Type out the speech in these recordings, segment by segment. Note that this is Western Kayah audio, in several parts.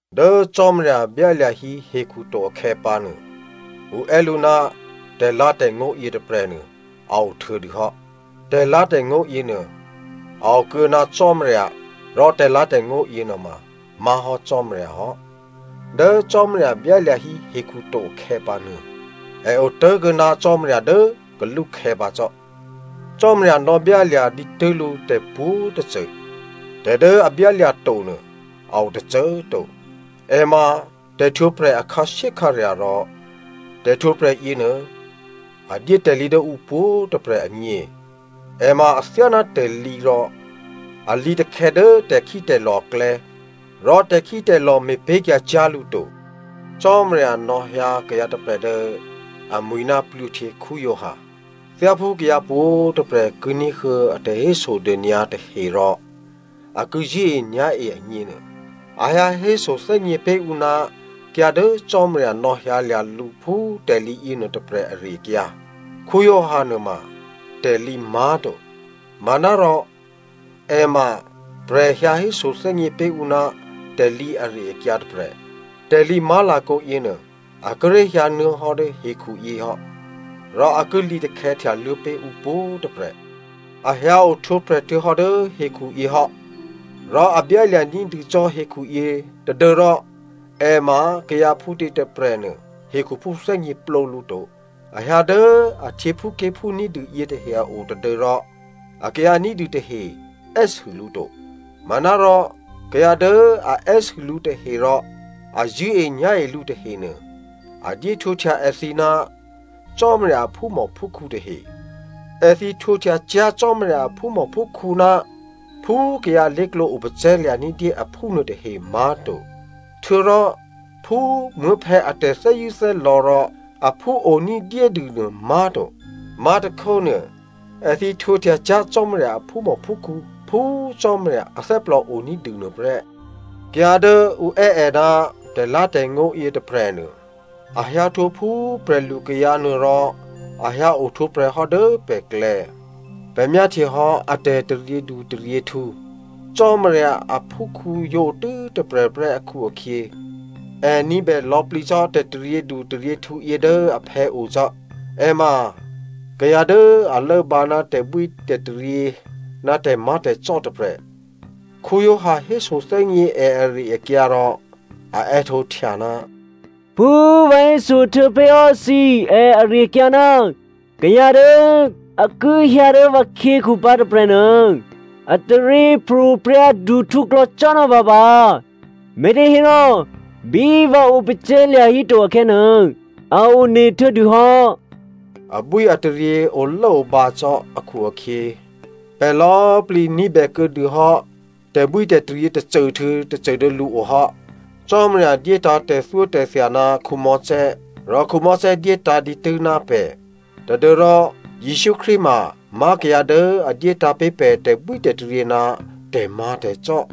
Dố Cò́marya byálya̤ hí hekhu to akhè̌pǎnuô, ǔ è́ lǔ ná tè̤lǎ̤tè̤ngó̤ yětôprè̤nuô, a ohtuô̌dû hò́. Tè̤lǎ̤tè̤ngó̤ yěnuô a o kuô̌ ná Cò́marya rò tè̤lǎ̤tè̤ngó̤ yěnuôma má̤hò́ Cò́marya hò́. Dố Cò́marya byálya̤ hí hekhu to akhè̌pǎnuô è otố̤kuô̌ ná Cò́marya dố kalúkhè̌ pǎ cò́. Cò́marya nò̌byálya̤ dǐtû́ lǔ tè̤pwǒ̤tôcô. Tè̤ dố a byálya̤ to nuô a o tôcô꤮ to. È ma tè̤htwǒprè̤ a khǎshyékhǎrya̤ rò tè̤htwǒprè̤ yěnuô a dyé tè̤lǐ dố ǔ pwǒ̤꤮ tôprè̤ agně. È ma athyáná tè̤lǐ rò a lǐtakhè̌ dố tè̤khítè̤lò̤ aklè̌ rò tè̤khítè̤lò̤ me̤pé̤kyǎ cyá̤ lǔ to. Cò́marya nò̌hyǎ kayǎ tôprè̤ dố amwi̤ ná Giovanni Baptista. Thyáphú kayǎ pwǒ̤꤮ tôprè̤ ki ní̤huô̌ a tè̤hésodônyǎ tahe rò a ki zṳ̂́enyá̤e agněnuô, a hyǎ hésothè́gně pé̤ ǔ ná kayǎ dố Cò́marya nò̌hyǎlya̤ lǔ phú tè̤lǐ yěnuô tôprè̤ ari-akyǎ. Giovanni nuôma tè̤lǐ má̤to. Manárò è ma prè̤ hyǎ hésothè́gně pé̤ ǔ ná tè̤lǐ ari-akyǎ tôprè̤. Tè̤lǐ má̤lakǒ yěnuô, a kíré̤ hyǎnuô̌ hò́ dố hekhuyě hò́, rò a ki lǐtakhè̌ htyaluô̌ pé̤ ǔ pwǒ̤꤮ tôprè̤. A hyǎ ohtwǒprè̤ htuô̌hò́ dố hekhuyě hò́. Rò a byálya̤ ní̤dû cò́ hekhuyě tadû́rò è ma kayǎ phútě tôprè̤nuô hekhuphú thè́gněplǒ lǔ to. A hyǎ dố a htyěphúké̤phú ní̤dû yětahe a o tadû́rò akayǎ ní̤dû tahe è́sû lǔ to. Manárò kayǎ dố a è́sû lǔ tahe rò a zṳ̂́enyá̤e lǔ tahenuô a dyéhtwǒhtya èthǐ ná Cò́marya a phúmòphúkhǔ tahe. Èthǐ htwǒhtya cyá̤ Cò́marya a phúmòphúkhǔ ná phú kayǎ lé̤klǒ opacè̤̌lya̤ ní̤dyé aphú nuôtahe má̤to. Htuô̌rò phú muố̤phè̌ a tè̤thè́zṳ̂́thè́lò̌ rò aphú o ní̤dyédû nuô má̤to. Má̤tôkhónuô, èthǐ htwǒhtya cyá̤ Cò́marya a phúmòphúkhǔ phú Cò́marya athè́plò oní̤dû nuôprè́. Kayǎ dố ǔ è́ è ná tè̤lǎ̤tè̤ngó̤ yětôprè̤nuô, a hyǎhtwǒ phú prè̤lukayǎ nuô rò a hyǎ ohtwǒprè̤ hò́ dố pè̤klè̌. Pè̤ myáhtyehò́ a tè̤taryědu taryěhtǔ. Cò́marya aphúkhǔ yǒ otû́ tôprè̤prè́ akhu-akhyě, è ní̤bè lò̌plǐ cò́ tè̤taryědu taryěhtǔ yě dố aphè̌o cò́. È ma kayǎ dố a lốbǎ ná tè̤bwítè̤taryě ná tè̤má̤tè̤cò́ tôprè̤. Giovanni hésothè́gně è ari-akyǎ rò a è́htǒhtya, “Phú vǎ héso htuô̌pé̤hò́ thǐ è ari-akyǎ, ‘Kayǎ dố a ki hyǎ dố vǎkhyěkhu pǎ tôprè̤nuô a taryěpro̤prya̤ duhtǔklò̌ cò́ ná vǎ pǎ, me̤těhérò bí vǎ opacè̤̌lya̤ híto akhè̌nuô, a one htuô̌dûhò́.’” Abwíataryě olốobǎ cò́ akhu-akhyě, pè̤ lò̌꤮ plǐ ní̤bè kuô̌dûhò́ tè̤bwítè̤taryě tôcô htuô̌ tôcô dố lǔo hò́. Cò́marya dyétǎ̤ tè̤thyótè̤thya ná Mosè rò Mosè dyétǎ̤ dǐtû́ ná pè̤, tadû́rò Jesǔ Krístu mamá̤ kayǎ dố a dyétǎ̤ pé̤ pè̤ tè̤bwítè̤taryě ná tè̤má̤tè̤cò́.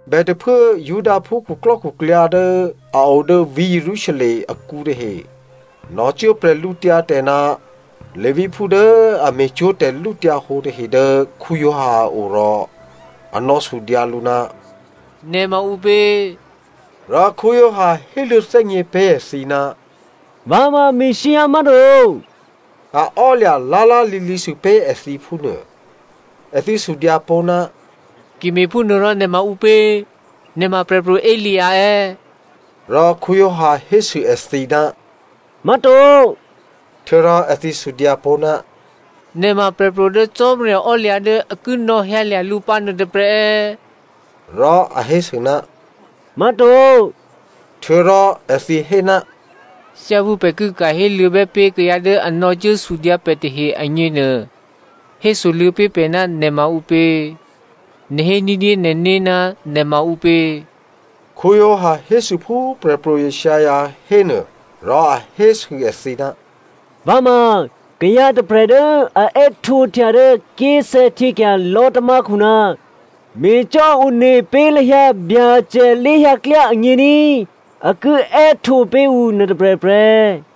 Bètôphuố Judaphú khuklò́khuklyǎ dố a o dố vǐ̤ Jerusalem akǔ tahe nò̌cuố bwídu ná Leviphú dố a me̤cwó̤ tè̤lǔhǒdu tahe dố Giovanni a o rò a nò̌sudyǎ lǔ, “Nè̤ ma ǔpě?” Rò Giovanni héluô̌ thè́gně pé̤ èthǐ, “Vǎ ma Messia má̤to.” A ò́lya̤ lá̤lá̤lǐlǐ sûpé̤ èthǐ phúnuô. Èthǐ sudyǎ pó̤, “Ki me̤phúnuôrò, nè̤ ma ǔpě? Nè̤ ma Prè̤pro̤ Elia è̌?” Rò Giovanni hésû èthǐ, “má̤to.” Htuô̌rò èthǐ sudyǎ pó̤, “Nè̤ ma prè̤pro̤ dố Cò́marya ò́lya̤ dố a ki nò̌hyǎlya̤ lǔ pǎ nuôtôprè̤ è̌?” Rò a hésû, “má̤to.” Htuô̌rò èthǐ hé, “Thyáphú pè̤ ki ka̤ héluô̌bè́ pé̤ kayǎ dố a nò̌cuố sudyǎ pè̤ tahe agněnuô, hésoluô̌ pé̤ pè̤ ná nè̤ ma ǔpě? Nè̤ hé ní̤dyé nè̤né̤ ná nè̤ ma ǔpě?” Giovanni hésû phú Prè̤pro̤ Isaiah hénuô, rò a hésû èthǐ, “Vǎ ma kayǎ tôprè̤ dố a è́htǒhtya dố ké̤sè̌htyěkya̤ lò̤́tamákhu, ‘Me̤cò́ one pé̤ lahyǎ Byacè lé̤hyǎ klyá agně ní꤮,’ a ki è́htǒ pé̤ ǔ nuôtôprè̤ prè́.”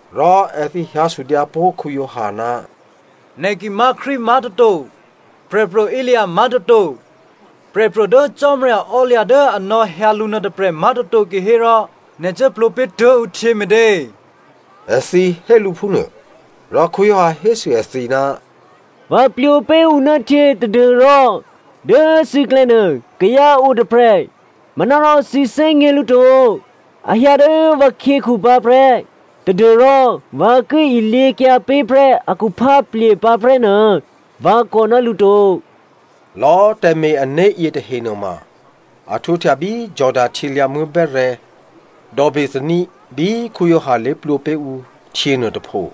rò èthǐ hyǎ sudyǎ pó̤ Giovanni, “Nè̤ ki má̤ Krístu má̤toto, Prè̤pro̤ Elia má̤toto, prè̤pro̤ dố Cò́marya ò́lya̤ dố a nò̌hyǎ lǔ nuôtôprè̤ má̤toto kihérò nè̤ cuố plwǒ pé̤ tuố̤ ǔ htyě me̤tě?” Èthǐ hé lǔ phúnuô, Rò Giovanni hésû èthǐ, “Vǎ plwǒ pé̤ ǔ ná htyě tadû́rò dố thǐklè̌ nuô kayǎ o tôprè̤ manárò thǐ thè́gně lǔ to. A hyǎ dố vǎkhyěkhu pǎ prè́ tadû́rò vǎ ki ilyěkyǎ pé̤ prè́ a khupháplye̤ pǎ prè́nuô vǎ kò ná lǔ to.” Lò̌꤮ tè̤me̤-ané̤ yětahe nuôma, a htwǒhtya bí Jordano htyělyǎ̤muố̤ bè́rè̤̌, dò̌ Bethania, bí Giovanni lé̤plwǒ pé̤ ǔ htyě nuôtôpho.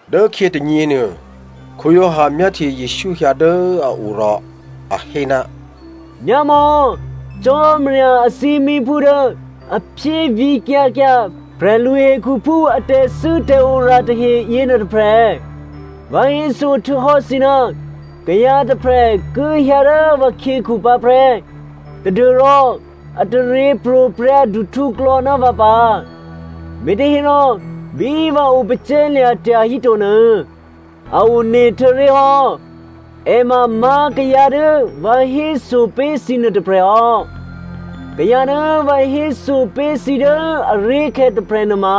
Dốkhyě tônyěnuô, Giovanni myáhtye Jesǔ hyǎ dố a o rò a hé, “Myámò̌, Cò́marya athímíphú dố a phyévǐkyǎ kyǎ prè̤lu hekhuphú a tè̤thû́tè̤ora tahe yěnuô tôprè̤. Vǎ héso htuô̌hò́ thǐ, ‘Kayǎ tôprè̤ ki hyǎ dố vǎkhyěkhu pǎ prè́ tadû́rò a taryěpro̤prya̤ duhtǔklò̌ ná vǎ pǎ, me̤těhérò bí vǎ opacè̤̌lya̤ tyahíto nuô, a one htuô̌ré̤hò́.’ È ma má̤ kayǎ dố vǎ héso pé̤ thǐ nuôtôprè̤ hò́. Kayǎ dố vǎ héso pé̤ thǐ dố aré̤khè̌ tôprè̤ nuôma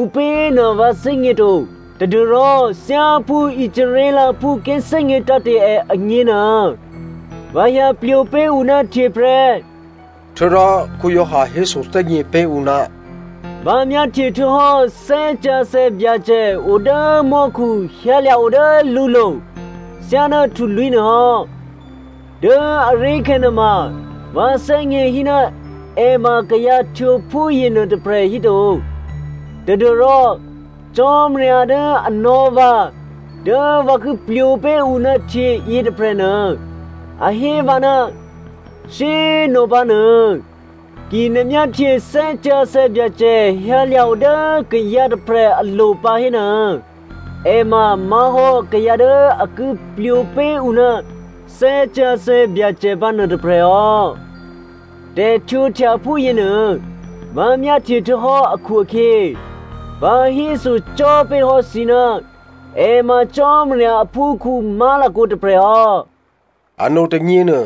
ǔpěnuô vǎ thè́gněto tadû́rò thyáphú Israelphú ki thè́gně tǎ̤te̤ è agněnuô, vǎ hyǎ plwǒ pé̤ ǔ ná htyě prè́.” Htuô̌rò Giovanni hésothè́gně pé̤ ǔ, “Vǎ myáhtye htuô̌hò́ Thè́ Sǎsè̌ Byacè o dố mò́khu hyǎlya̤ o dố lǔlo̤ thyáná htulwí̤ nuôhò́. Dố aré̤khè̌ nuôma vǎ thè́gněhí ná è ma kayǎ htwǒ phúyěnuô tôprè̤ híto tadû́rò Cò́marya dố a nò̌ vǎ dố vǎ ki plwǒ pé̤ ǔ ná htyě yětôprè̤nuô a hé vǎ, ‘Shyé꤮ nopǎ nuô, ki nè̤ myáhtye Thè́ Sǎsè̌ Byacè hyǎlya̤ o dố kayǎ tôprè̤ alo̤ pǎ hénuô è ma má̤hò́ kayǎ dố a ki plwǒ pé̤ ǔ ná Thè́ Sǎsè̌ Byacè pǎ nuôtôprè̤ hò́.’ Tè̤htwǒhtya phúyěnuô, vǎ myáhtye htuô̌hò́ akhu-akhyě, vǎ hésocò́ pé̤hò́ thǐ ná è ma Cò́marya aphúkhǔ má̤lakǒ tôprè̤ hò́.” Ano tônyěnuô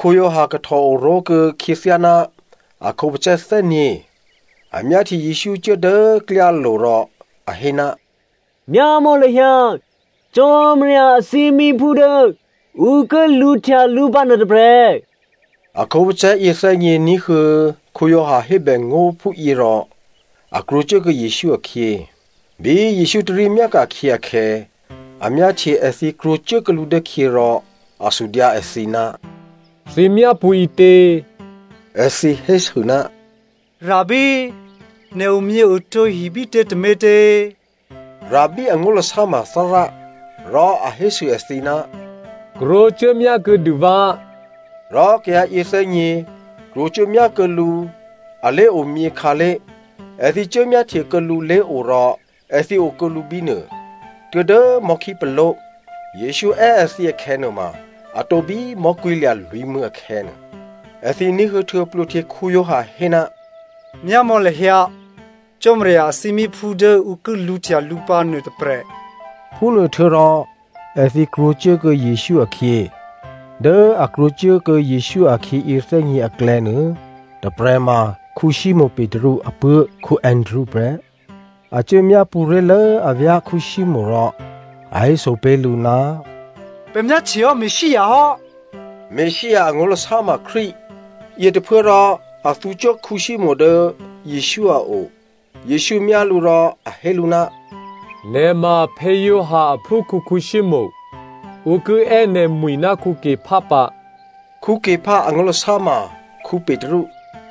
Giovanni kahtò oró̤kuô̌ khyěthyá ná a khǒpacè̤̌ thè́nyě̤. A myáhtye Jesǔ cuố dố klyálo̤ rò a hé, “Myámò̌ lahyǎ, Cò́marya athímíphú dố ǔ ki lǔhtya lǔ pǎ nuôtôprè̤.” A khǒpacè̤̌ yěthè́nyě̤ ní̤huô̌ Giovanni hébèngó̤ phúyě rò a krwǒcuốkuô̌ Jesǔ akhyě. Bí Jesǔ tarí myáka̤khyě akhè̌, a myáhtye èthǐ krwǒcuốkuô̌ lǔ dố khyě rò a sudyǎ èthǐ, “Thǐ myápṳ̌ ǐtě?” Èthǐ hésû, “Rabbi, nè̤ omyěotǒ hi bítě tômětě?” (Rabbi angó̤lasá ma Thárá) Rò a hésû èthǐ, “Krwǒcuốmyá kuô̌dû vǎ,” Rò kayǎ yěthè́nyě̤ krwǒcuốmyá kuô̌ lǔ a lé̤omyě khǎlé̤. Èthǐ cuốmyáhtye kuô̌ lǔ lé̤o rò èthǐ okuô̌ lǔ bínuô tuố̤dố mò̤́khípaló̤. Jesǔ è́ èthǐ akhè̌nuôma a tǒbí mò̤́kwí̤lya̤ lwǐ̤mû̌ akhè̌nuô. Èthǐ ní̤huô̌ htuô̌ Giovanni Baptista hé, “Myámò̌ lahyǎ, Cò́marya athímíphú dố ǔ ki lǔhtya lǔ pǎ nuôtôprè̤,” phúnuô htuô̌rò èthǐ krwǒcuốkuô̌ Jesǔ akhyě. Dố a krwǒcuốkuô̌ Jesǔ akhyě yěthè́nyě̤ aklè̌nuô, tôprè̤ ma Simonè Petru apuố̤ Andrea prè́. A cuố myápṳ̌ ré̤lố avyá̤ Simonè rò a héso pé̤ lǔ, “Pè̤ myáhtyehò́ Messia hò́” (Messia angó̤lasá ma Krístu) yětôphuốrò a thǔcuố Simonè dố Jesǔ a o. Jesǔ myá lǔ rò a hé lǔ, “Nè̤ ma Giovanni aphúkhǔ Simonè. Ǔ ki è́ nè̤ mwi̤ ná Kepha pǎ,” (Kepha angó̤lasá ma Petru).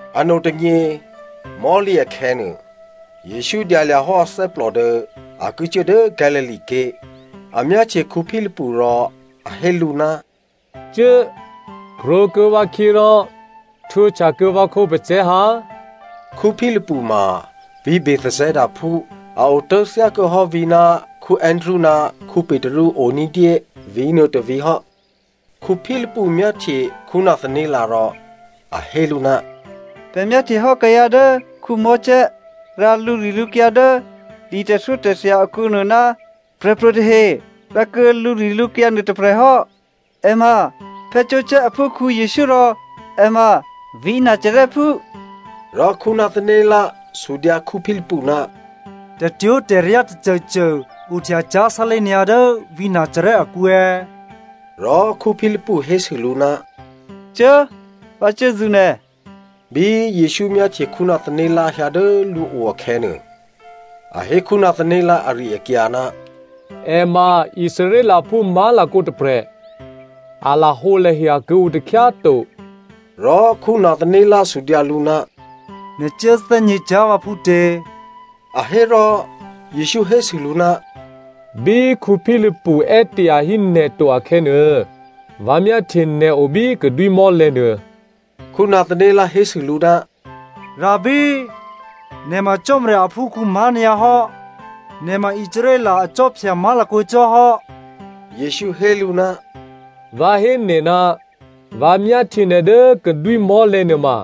Ano tônyě mò̤́lǐ akhè̌nuô, Jesǔ dyalya̤ hò́ athè́plò dố a ki cuố dố Galilea ké̤. A myáhtye Philipu rò a hé lǔ, “Cuố! Krwǒkuô̌ vǎkhyě rò htwǒhtyakuô̌ vǎ khǒpacè̤̌ ha.” Philipu ma vǐ̤ Bethsaidaphú, a otố̤ thyákuô̌ hò́ vǐ̤ ná Andrea ná Petru o ní̤dyé vǐ̤nuô tôvǐ̤ hò́. Philipu myáhtye Nathanael rò a hé lǔ, “Pè̤ myáhtyehò́ kayǎ dố Mosè rǎ lǔrilǔkyǎ dố li tè̤thyótè̤thya akǔnuô ná prè̤pro̤ tahe rǎkuô̌ lǔrilǔkyǎ nuô tôprè̤ hò́. È ma Joseph aphúkhǔ Jesǔ rò è ma vǐ̤ Nazarèphú.” Rò Nathanael sudyǎ Philipu, “Tè̤twó̤tè̤ryá tôcôcô ohtya cyá̤ sálé̤ nyǎ dố vǐ̤ Nazarè akǔ è̌?” Rò Philipu hésû lǔ, “Cuố꤮, vǎ cuốzṳ̌ nè̤.” Bí Jesǔ myáhtye Nathanael hyǎ dố lǔo akhè̌nuô, a hé Nathanael ari-akyǎ, “È ma Israelphú má̤lakǒ tôprè̤. A lahǒlahya kuô̌ǔ takhyá꤮ to.” Rò Nathanael sudyǎ lǔ, “Nè̤ cuố thè́gně cyá̤ vǎ phútě?” A hé rò Jesǔ hésû lǔ, “Bí Philipu è́ tyahí nè̤ to akhè̌nuô, vǎ myáhtye nè̤ o bí kadwímò̤́lè̤̌ nuô.” Nathanael hésû lǔ, “Rabbi꤮ nè̤ ma Cò́marya aphúkhǔ má̤nyǎ hò́, nè̤ ma Israel akhwí má̤lakǒ cò́ hò́.” Jesǔ hé lǔ, “Vǎ hé nè̤ ná vǎ myáhtye nè̤ dố kadwímò̤́lè̤̌ nuôma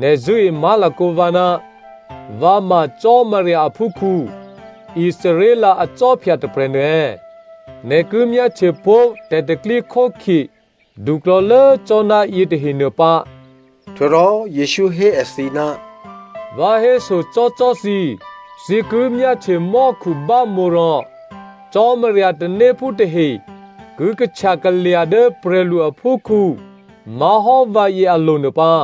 nè̤ zṳ̂́e má̤lakǒ vǎ ná vǎ ma Cò́marya aphúkhǔ, Israel akhwí tôprè̤nuô è̌? Nè̤ ki myáhtyepó̤ tè̤pro̤tè̤prya̤ duklò̌lố cò́ ná yětahenuô pǎ.” Htuô̌rò Jesǔ hé èthǐ, “Vǎ hésocò́cò́ thǐ, thǐ ki myáhtye mò́khu bámǒ rò Cò́marya tanéphú tahe ki kahtya kalya̤ dố prè̤lu aphúkhǔ má̤hò́ vǎyě alo̤nuô pǎ.”